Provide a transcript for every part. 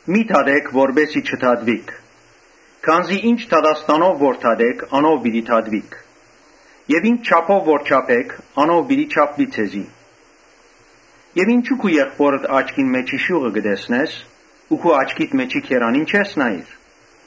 Մի՛ դատէք, որպէս զի չդատուիք։ Քանզի ի՛նչ դատաստանով որ դատէք, անով պիտի դատուիք եւ ի՛նչ չափով որ չափէք անով պիտի չափուի ձեզի։ Եւ ինչո՞ւ եղբօրդ աչքին մէջի շիւղը կը տեսնես ու քու աչքիդ մէջի գերանին չես նայիր։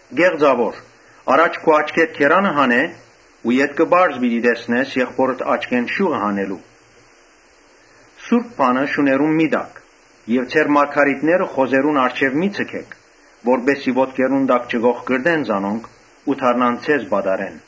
Կե՛ղծաւոր, առաջ քու աչքէդ գերանը հանէ ու ետքը պարզ պիտի տեսնես եղբօրդ աչքին շիւղը հանելու։ «Սուրբ բանը շուներուն մի՛ տաք եւ ձեր մարգարիտները խոզերուն առջեւ մի՛ ձգէք, որպէս զի ոտքերնուն տակ չկոխկռտեն զանոնք ու դառնան ձեզ պատառեն»։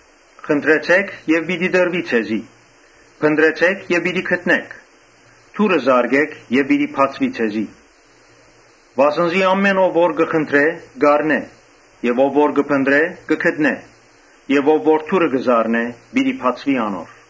«Խնդրեցէ՛ք եւ պիտի տրուի ձեզի. փնտռեցէ՛ք եւ պիտի գտնէք. դուռը զարկէք եւ պիտի բացուի ձեզի։ Վասն զի ամէն ով որ կը խնդրէ՝ կ’առնէ, եւ ով որ կը փնտռէ՝ կը գտնէ եւ ով որ դուռը կը զարնէ՝ պիտի բացուի անոր։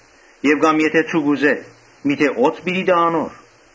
Եւ կամ եթէ ձուկ ուզէ, օձ տայ անոր։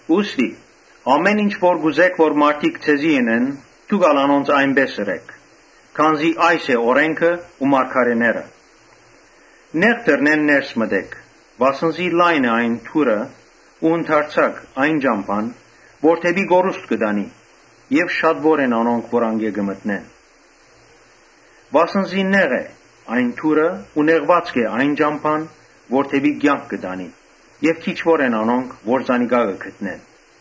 «Ուստի ամէն ինչ որ կ’ուզէք որ մարդիկ ձեզի ընեն, դուք ալ անոնց այնպէս ըրէք, քանզի այս է օրէնքը ու մարգարէները»։ «Նեղ դռնէն ներս մտէք. վասն զի լայն է այն դուռը ու ընդարձակ՝ այն ճամբան, որ դէպի կորուստ կը տանի եւ շատուոր են անոնք, որ անկէ կը մտնեն։ Վասն զի նեղ է այն դուռը ու նեղուածք է այն ճամբան, որ դէպի կեանք կը տանի եւ քիչուոր են անոնք որ զանիկա կը գտնեն»։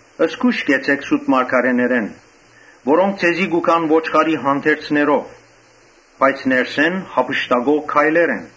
«Զգոյշ կեցէք սուտ մարգարէներէն, որոնք ձեզի կու գան ոչխարի հանդերձներով, բայց ներսէն յափշտակող գայլեր են։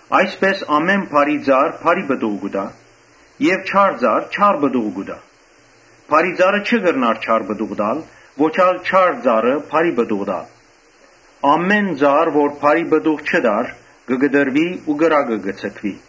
Այսպէս ամէն բարի ծառ բարի պտուղ կու տայ եւ չար ծառ չար պտուղ կու տայ։ Բարի ծառը չի կրնար չար պտուղ տալ, ոչ ալ չար ծառը բարի պտուղ տալ։ Ամէն ծառ որ բարի պտուղ չի տար, կը կտրուի ու կրակը կը ձգուի։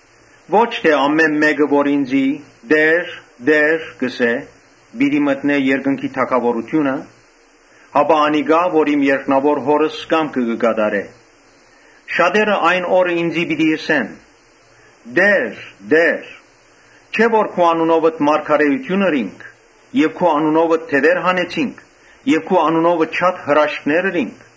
«Ոչ թէ ամէն ով որ ինծի ‘Տէ՛ր, Տէ՛ր’, կ’ըսէ, պիտի մտնէ երկնքի թագաւորութիւնը, հապա անիկա՝ որ իմ երկնաւոր Հօրս կամքը կը կատարէ։ Շատերը այն օրը ինծի պիտի ըսեն. ‘Տէ՛ր, Տէ՛ր, չէ՞ որ քու անունովդ մարգարէութիւն ըրինք եւ քու անունովդ դեւեր հանեցինք ու քու անունովդ շատ հրաշքներ ըրինք’։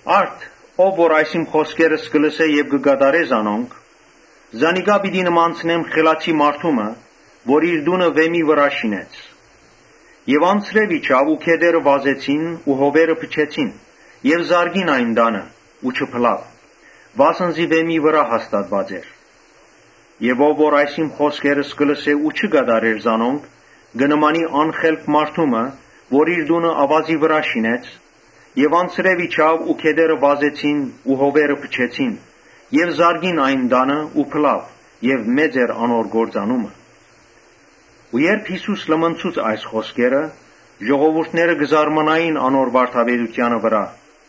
«Արդ ով որ իմ խօսքերս կը լսէ եւ կը կատարէ զանոնք, զանիկա պիտի նմանցնեմ խելացի մարդու մը՝ որ իր տունը վէմի վրայ շինեց։ Անձրեւ իջաւ ու գետերը վազեցին ու հովերը փչեցին, զարկին այդ տանը, բայց չփլաւ, վասն զի վէմի վրայ հաստատուած էր։ Այն որ այս իմ խօսքերս կը լսէ ու չի կատարեր, կը նմանի անխելք մարդու մը՝ որ իր տունը աւազի վրայ շինեց։ Անձրեւ իջաւ ու գետերը վազեցին ու հովերը փչեցին եւ զարկին այն տանը ու փլաւ։ Մեծ էր անոր կործանումը»։ Ու երբ Յիսուս լմնցուց այս խօսքերը, ժողովուրդը կը զարմանար անոր վարդապետութեանը վրայ։